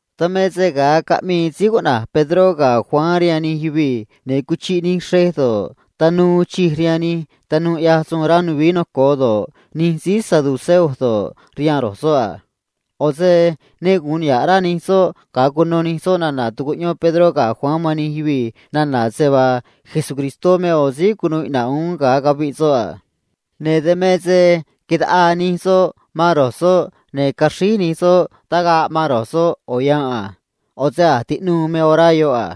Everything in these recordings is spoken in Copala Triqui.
Dan me se ga̱a caꞌmii síí cuꞌna̱j Pedró ga̱ Juan rihaan nij yuvii̱, ne̱ cuchiꞌ nij xrej do̱ꞌ, tanuu uun chij rihaan nij tanuu ꞌyaj suun rá nuvií noco̱o do̱ꞌ, nij síí saduceo do̱ꞌ, rihaan ro̱j soꞌ a. ꞌO̱ se ne gu̱un niha̱ꞌ rá nij soꞌ ga̱a cuno nij soꞌ nana̱ tucuꞌyón Pedró ga̱ Juan man nij yuvii̱ nana̱ se vaa Jesucristó me ꞌo̱ síí cunuu iꞌna̱ꞌ uún ga̱a caviꞌ soꞌ a. Ne̱ dan me se quitaꞌaa nij soꞌ man ro̱j soꞌ, ne̱ caxríj nij soꞌ tagaꞌ man ro̱j soꞌ ꞌo̱ yanꞌ a. ꞌO̱ se a̱j tiꞌnuu me orá yoꞌ a.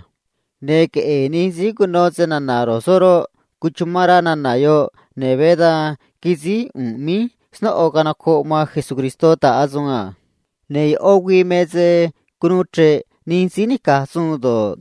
Ne̱ queꞌe̱e̱ nij síí cuno se na̱na̱ ro̱j soꞌ roꞌ, cuchumán rá nana̱ yoꞌ, ne̱ veé da̱nj quisíj ꞌu̱nꞌ míj snóꞌo canocoꞌ man Jesucristó ta̱ꞌ asuun a. Ne̱ yoꞌó güii me se cunuu chre̱ꞌ nij síí nica̱j suun do̱ꞌ,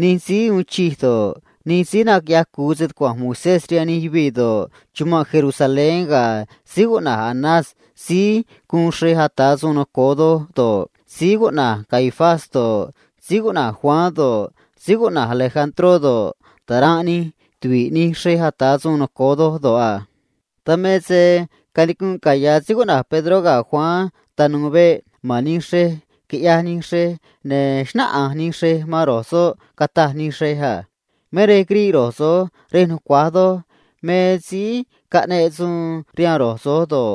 nij síí uun chij do̱ꞌ, nij síí naquiꞌyaj cu̱u se tucua̱nj Moisés rihaan nij yuvii̱ do̱ꞌ, chumanꞌ Jerusalén ga̱ síí cuꞌna̱j Anás síí guun xrej ata̱ suun noco̱o doj do̱ꞌ, síí cuꞌna̱j Caifás do̱ꞌ, síí cuꞌna̱j Juan do̱ꞌ, síí cuꞌna̱j Alejandró do̱ꞌ, taranꞌ nij tuvi̱ꞌ nij xrej ata̱ suun noco̱o doj do̱ꞌ a. Dan me se canicunꞌ caya̱ síí cuꞌna̱j Pedró ga̱ Juan tanu̱u̱ veꞌ ma̱n nij xrej, quiꞌyaj nij xrej, ne̱ xnáꞌanj nij xrej man ro̱j soꞌ, cataj nij xrej a: ―Me rej quiriꞌ ro̱j so̱j rej nucua̱j do̱ꞌ, me síí caꞌneꞌ suun rihaan ro̱j so̱j do̱ꞌ,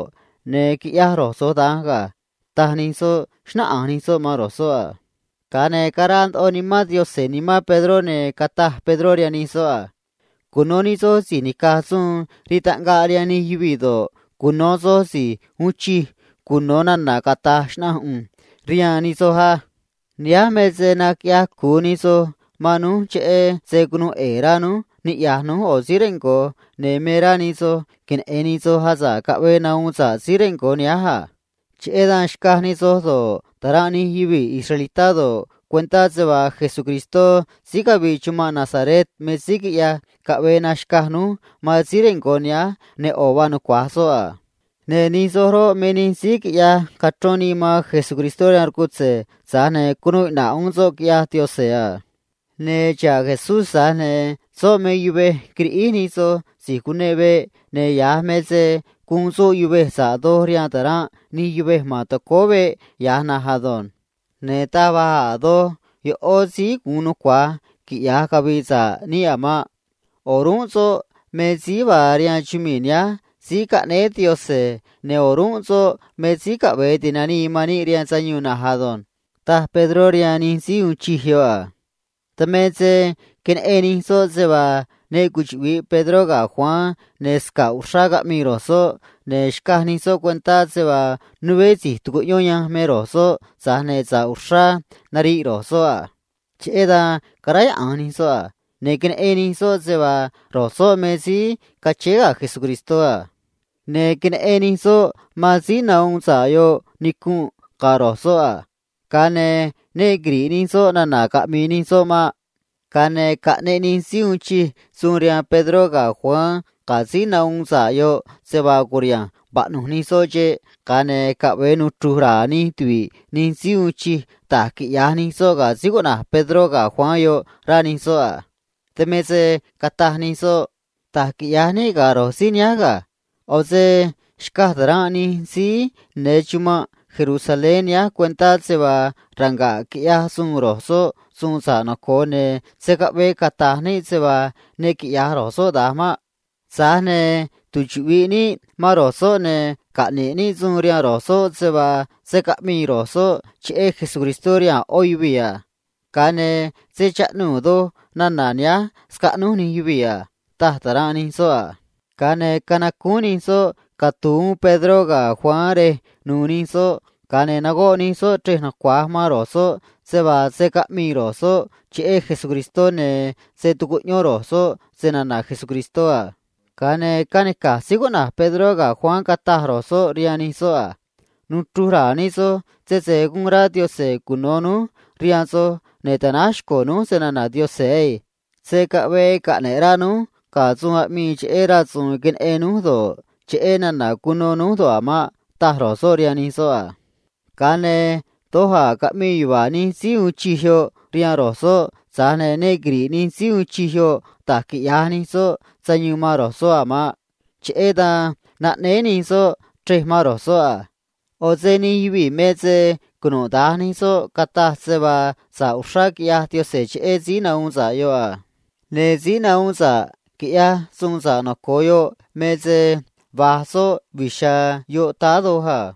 ne̱ quiꞌyaj ro̱j so̱j da̱nj ga̱ ―taj nij soꞌ, xnáꞌanj nij soꞌ man ro̱j soꞌ a. Ga̱a ne̱ caraa ndoꞌo Nimán Diose̱ nimán Pedró, ne̱ cataj Pedró rihaan nij soꞌ a: ―Cuno̱ nij soj si̱j nica̱j suun rii taꞌngaꞌ rihaan nij yuvii̱ do̱ꞌ, cuno̱ soj si̱j uun chij cuno̱ nana̱ cata̱j xnaꞌanj ꞌu̱nj rihaan nij soj á. Nihánj me se naquiꞌya̱j cu̱u nij soj man rój cheꞌé se cunuu ꞌe̱e̱ rá rój niꞌya̱j rój ꞌo̱ síí rengo̱, ne̱ me rá nij soj queneꞌe̱n soj asa̱ꞌ caꞌvee nahuun sa̱ꞌ síí rengo̱ nihánj a. Cheꞌé dan xca̱j nij soj do̱ꞌ, taranꞌ nij yuvii̱ israelitá do̱ꞌ, cuentá se vaa Jesucristó síí cavii chumanꞌ Nazaret me síí quiꞌyaj caꞌvee naxca̱j rój man síí rengo̱ nihánj, ne̱ ꞌo̱ vaa nucua̱j soꞌ a. Ne̱ nij soj roꞌ, me nij síí quiꞌyaj cachrón nii man Jesucristó rihaan rcutze̱, tza̱j ne̱ cunuu iꞌna̱ꞌ uún soꞌ, quiꞌyaj Diose̱ a. Ne̱ xa̱ꞌ Jesús, tza̱j ne̱ soꞌ me yuvej quiriꞌíj nij soj si̱j cune̱ꞌ veꞌ, ne̱ ya̱j me se guun soꞌ yuvej sa̱ꞌ doj rihaan taranꞌ nij yuvej ma̱n tacóó veꞌ ya̱j na̱nj ado̱nj. Ne̱ taj va̱j a̱ doj yoꞌó síí gu̱un nucua̱j quiꞌya̱j cavi̱i̱ sa̱ꞌ níꞌ a̱ maꞌ. O̱rúnꞌ soꞌ me síí vaa rihaan chumii̱ nihánj síí caꞌnéé Diose̱, ne̱ o̱rúnꞌ soꞌ me síí caꞌve̱e ti̱nanii man níꞌ rihaan sayuun na̱nj ado̱nj ―taj Pedró rihaan nij síí uun chij yoꞌ a. Dan me se queneꞌen nij soꞌ se vaa ne cuchuꞌvi̱ꞌ Pedró ga̱ Juan ne̱ sca̱ꞌ uxrá caꞌmii ro̱j soꞌ, ne̱ xcaj nij soꞌ cuentá se vaa nuveé si̱j tucuꞌyón yanj me ro̱j soꞌ, tza̱j ne̱ sa̱ꞌ uxrá nariꞌ ro̱j soꞌ a. Cheꞌé dan caráyaꞌa̱nj nij soꞌ a. Ne̱ queneꞌen nij soꞌ se vaa ro̱j soꞌ me síí cachéé ga̱ Jesucristó a. Ne̱ queneꞌen nij soꞌ man síí nahuun sa̱ꞌ yoꞌ nicu̱nꞌ ga̱ ro̱j soꞌ a. Ga̱a ne̱ ne quiri̱ꞌ nij soꞌ nana̱ caꞌmi̱i̱ nij soꞌ maꞌ. Ga̱a ne̱ caꞌneꞌ nij síí uun chij suun rihaan Pedró ga̱ Juan ga̱ síí nahuun sa̱ꞌ yoꞌ se vaa cu̱riha̱nj vaꞌnu̱j nij soꞌ xeꞌ, ga̱a ne̱ caꞌve̱e nuchru̱j ra̱a̱ nij tuvi̱ꞌ nij síí uun chij da̱j quiꞌya̱j nij soꞌ ga̱ síí cuꞌna̱j Pedró ga̱ Juan yoꞌ, rá nij soꞌ a. Dan me se cataj nij soꞌ: ―Da̱j quiꞌya̱j níꞌ ga̱ ro̱j síí nihánj ga̱. ꞌO̱ se xcaj taranꞌ nij síí ne̱ chumanꞌ Jerusalén nihánj cuentá se vaa ranga̱ꞌ quiꞌyaj suun ro̱j soꞌ suun sa̱ꞌ noco̱o, ne̱ se̱ caꞌvee cata̱j níꞌ se vaa ne quiꞌya̱j ro̱j soꞌ da̱nj maꞌ. Tza̱j ne̱ tuchuꞌvi̱ꞌ níꞌ man ro̱j soꞌ ne̱ caꞌne̱ꞌ níꞌ suun rihaan ro̱j soꞌ se vaa se̱ caꞌmii ro̱j soꞌ cheꞌé Jesucristó rihaan a̱ ꞌó yuvii̱ a. Ga̱a ne̱ se̱ chaꞌnuu̱ doj nana̱ nihánj scaꞌnúj nij yuvii̱ a ―taj taranꞌ nij soꞌ a. Ga̱a ne̱ canacúún nij soꞌ catu̱u̱ uún Pedró ga̱ Juan rej nu̱u̱ nij soꞌ, ga̱a ne̱ nagoꞌ nij soꞌ chrej nucua̱j man ro̱j soꞌ se vaa se̱ caꞌmii ro̱j soꞌ cheꞌé Jesucristó ne̱ se̱ tucuꞌyón ro̱j soꞌ se na̱na̱ Jesucristó a. Ga̱a ne̱ canica̱j síí cuꞌna̱j Pedró ga̱ Juan cataj ro̱j soꞌ rihaan nij soꞌ a: ―Nuchru̱j ra̱a̱ nij soj sese gu̱un rá Diose̱ cuno̱ núj rihaan soj ne̱ ta̱náj xco̱ núj se na̱na̱ Diose̱ ei. Se̱ caꞌvee caꞌne̱ꞌ rá núj ga̱ suun aꞌmii cheꞌé rasu̱u̱n queneꞌen núj do̱ꞌ, cheꞌé nana̱ cuno núj do̱ꞌ a̱ maꞌ ―taj ro̱j soꞌ rihaan nij soꞌ a. Ga̱a ne̱ doj a̱ caꞌmii yuva̱a̱ nij síí uun chij yoꞌ rihaan ro̱j soꞌ, tza̱j ne̱ ne quiri̱ꞌ nij síí uun chij yoꞌ da̱j quiꞌya̱j nij soꞌ sayuun man ro̱j soꞌ a̱ maꞌ. Cheꞌé dan naꞌnéé nij soꞌ chrej man ro̱j soꞌ a. ꞌO̱ se nij yuvii̱ me se cunuda̱nj nij soꞌ cataj se vaa sa̱ꞌ uxrá quiꞌyaj Diose̱ cheꞌé síí nahuun sa̱ꞌ yoꞌ a. Ne̱ síí nahuun sa̱ꞌ quiꞌyaj suun sa̱ꞌ noco̱o yoꞌ me se va̱j soꞌ vi̱j chiha̱a̱ yoꞌ táá doj a.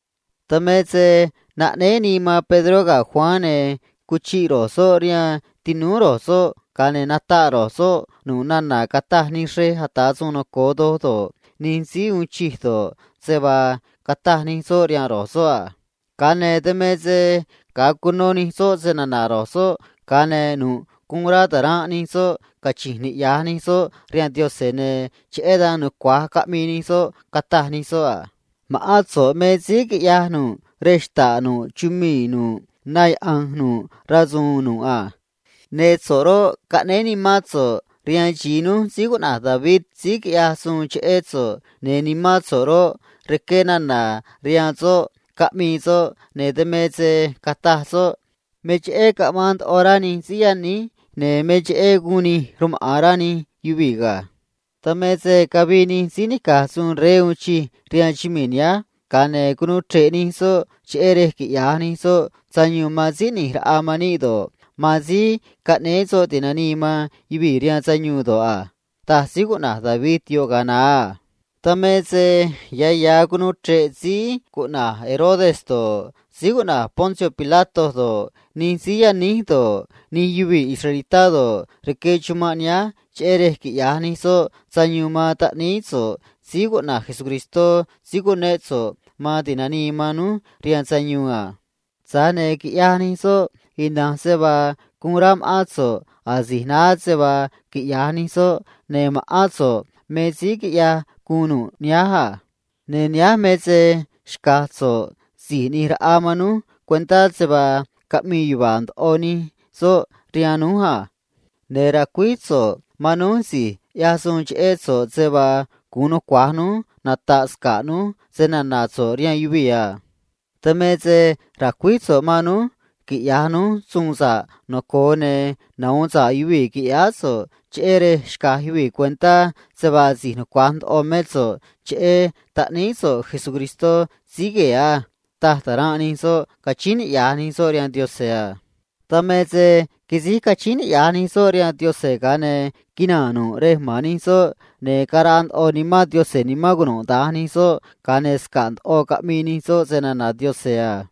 Dan me se naꞌnéé nii man Pedró ga̱ Juan, ne̱ cuchiꞌ ro̱j soꞌ rihaan tinúú ro̱j soꞌ, ga̱a ne̱ nataꞌ ro̱j soꞌ nu̱ꞌ nana̱ cataj nij xrej ata̱ suun noco̱o doj do̱ꞌ, nij síí uun chij do̱ꞌ, se vaa cataj nij soꞌ rihaan ro̱j soꞌ a. Ga̱a ne̱ dan me se ga̱a cuno nij soꞌ se na̱na̱ ro̱j soꞌ, ga̱a ne̱ nu̱ꞌ guun rá taranꞌ nij soꞌ cachi̱nj niꞌya̱j nij soꞌ rihaan Diose̱, ne̱ cheꞌé dan nucua̱j caꞌmii nij soꞌ, cataj nij soꞌ a: ―Ma̱ꞌán so̱ꞌ me síí quiꞌyaj nu̱ꞌ rej xta̱ꞌ nu̱ꞌ chumii̱ nu̱ꞌ na yaꞌa̱nj nu̱ꞌ rasu̱u̱n nu̱ꞌ a. Ne̱ so̱ꞌ roꞌ, caꞌnéé Nimán so̱ꞌ rihaan xi̱i núj síí cuꞌna̱j David síí quiꞌyaj suun cheꞌé so̱ꞌ, ne̱ Nimán so̱ꞌ roꞌ, rqué nana̱ rihaan soꞌ caꞌmi̱i̱ soꞌ, ne̱ dan me se cataj soꞌ: “Me cheꞌé caꞌmaan ndoꞌo rá nij síí yaníj, ne̱ me cheꞌé guun nij rmaꞌa̱n rá nij yuvii̱ ga̱. Dan me se cavii nij síí nica̱j suun rey uun chij rihaan chumii̱ nihánj, ga̱a ne̱ cunuu chre̱ꞌ nij soꞌ, cheꞌé rej quiꞌya̱j nij soꞌ sayuun man síí ꞌni̱j raꞌa man níꞌ do̱ꞌ, man síí caꞌnéé soꞌ ti̱nanii man yuvii̱ rihaan sayuun do̱ꞌ a”, taj síí cuꞌna̱j David yoꞌ ga̱a naá a. Dan me se ya̱ ya̱ cunuu chre̱ꞌ síí cuꞌna̱j Herodes do̱ꞌ, síí cuꞌna̱j Poncio Pilato do̱ꞌ, nij síí yaníj do̱ꞌ, nij yuvii̱ israelitá do̱ꞌ, rque chumanꞌ nihánj, cheꞌé rej quiꞌya̱j nij soꞌ sayuun man taꞌníí so̱ꞌ síí cuꞌna̱j Jesucristó síí cunéꞌ so̱ꞌ man ti̱nanii man núj rihaan sayuun a. Tza̱j ne̱ quiꞌyaj nij soꞌ ina̱nj se vaa guun rá ma̱ꞌán so̱ꞌ asi̱j naá se vaa quiꞌya̱j nij soꞌ, ne̱ ma̱ꞌán so̱ꞌ me síí quiꞌyaj guun nu̱ꞌ nihánj a. ”Ne̱ nihánj me se xca̱j so̱ꞌ si̱j ꞌni̱j raꞌa man núj cuentá se vaa caꞌmii yuva̱a̱ ndoꞌo nij soꞌ rihaan núj a. Ne̱ ra̱cuíj so̱ꞌ man núj si̱j ꞌyaj suun cheꞌé so̱ꞌ se vaa gu̱un nucua̱j núj nata̱ꞌ sca̱ꞌ núj se na̱na̱ so̱ꞌ rihaan yuvii̱ a. Dan me se ra̱cuíj so̱ꞌ man núj quiꞌya̱j núj suun sa̱ꞌ noco̱o, ne̱ nahu̱un sa̱ꞌ yuvii̱, qui̱ꞌyáá so̱ꞌ, cheꞌé rej xca̱j yuvii̱ cuentá se vaa si̱j nucua̱j ndoꞌo mé so̱ꞌ cheꞌé taꞌníí so̱ꞌ Jesucristó síí gue̱e̱ á ―taj taranꞌ nij soꞌ, cachíín niꞌya̱j nij soꞌ rihaan Diose̱ a. Dan me se quisíj cachíín niꞌya̱j nij soꞌ rihaan Diose̱, ga̱a ne̱ quinaa̱n nu̱ꞌ rej ma̱n nij soꞌ, ne̱ caraa ndoꞌo Nimán Diose̱ nimán cunuda̱nj nij soꞌ, ga̱a ne̱ sca̱ꞌ ndoꞌo caꞌmii nij soꞌ se na̱na̱ Diose̱ a.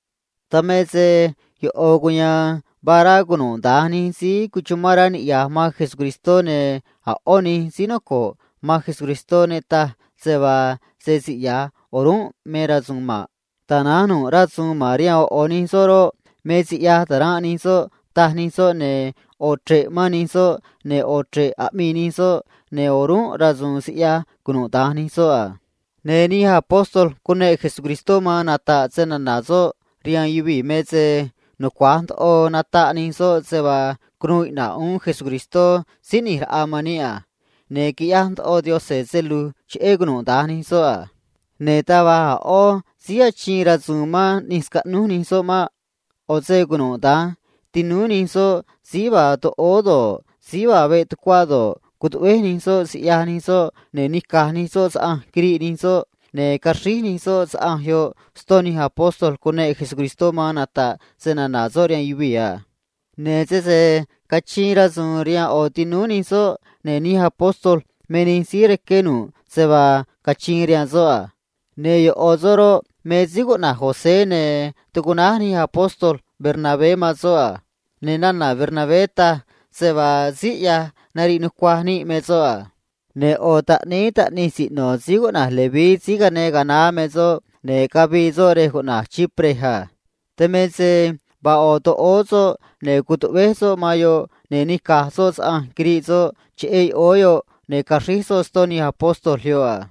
Dan me se yoꞌo̱ cuya̱a̱n vaa rá cunuda̱nj nij síí cuchumán rá niꞌya̱j man Jesucristó, ne̱ a̱ ꞌó nij síí noco̱ꞌ man Jesucristó ne taj se vaa se siꞌya̱j o̱rúnꞌ me rasu̱u̱n maꞌ. Tana̱nj nu̱ꞌ rasu̱u̱n ma̱n rihaan ꞌo̱ ꞌo̱ nij soꞌ roꞌ, me siꞌyaj taranꞌ nij soꞌ, taj nij soꞌ, ne̱ ꞌo̱ chre̱ꞌ mán nij soꞌ, ne̱ ꞌo̱ chre̱ꞌ aꞌmii nij soꞌ, ne̱ o̱rúnꞌ rasu̱u̱n siꞌyaj cunuda̱nj nij soꞌ a. Ne̱ nij apóstol cuneꞌ Jesucristó man nata̱ꞌ se na̱na̱ soꞌ rihaan yuvii̱ me se nucua̱j ndoꞌo nataꞌ nij soꞌ se vaa cunuu iꞌna̱ꞌ uún Jesucristó si̱j ꞌni̱j raꞌa man níꞌ a. Ne̱ quiꞌyaj ndoꞌo Diose̱ se lu̱j cheꞌé cunuda̱nj nij soꞌ a. Ne̱ taj va̱j a̱ ꞌó síí achiin rasu̱u̱n man ꞌni̱j scaꞌnúj nij soꞌ maꞌ. ꞌO̱ se cunuda̱nj tinúú nij soꞌ síí vaa toꞌóó do̱ꞌ, síí vaa veꞌ tucuá do̱ꞌ, cutuꞌvéj nij soꞌ siꞌyaj nij soꞌ, ne̱ nica̱j nij soꞌ saꞌanj quiriꞌ nij soꞌ, ne̱ caxríj nij soꞌ saꞌanj yoꞌ ston nij apóstol cuneꞌ Jesucristó man nata̱ꞌ se na̱na̱ soꞌ rihaan yuvii̱ a. Ne̱ sese cachiin rasu̱u̱n rihaan ꞌo̱ tinúú nij soꞌ, ne̱ nij apóstol me nij síí rqué nu̱ꞌ se vaa cachiin rihaan soꞌ a. Ne̱ yoꞌo̱ soꞌ roꞌ, me síí cuꞌna̱j José, ne̱ tucuꞌnáj nij apóstol Bernabé man soꞌ a. Ne̱ nana̱ Bernabé taj se vaa síí ꞌyaj nariꞌ nucuaj níꞌ me soꞌ a. Ne̱ ꞌo̱ taꞌníí taꞌnij siꞌno̱ síí cuꞌna̱j Leví síí cane ga̱a naá me soꞌ, ne̱ cavii soꞌ rej cuꞌna̱j Chipre a. Dan me se vaa ꞌo̱ toꞌóó soꞌ, ne̱ cutuꞌvéj soꞌ man yoꞌ, ne̱ nica̱j soꞌ saꞌanj quiriꞌ soꞌ cheꞌé yoꞌóó yoꞌ, ne̱ caxríj soꞌ ston nij apóstol yoꞌ a.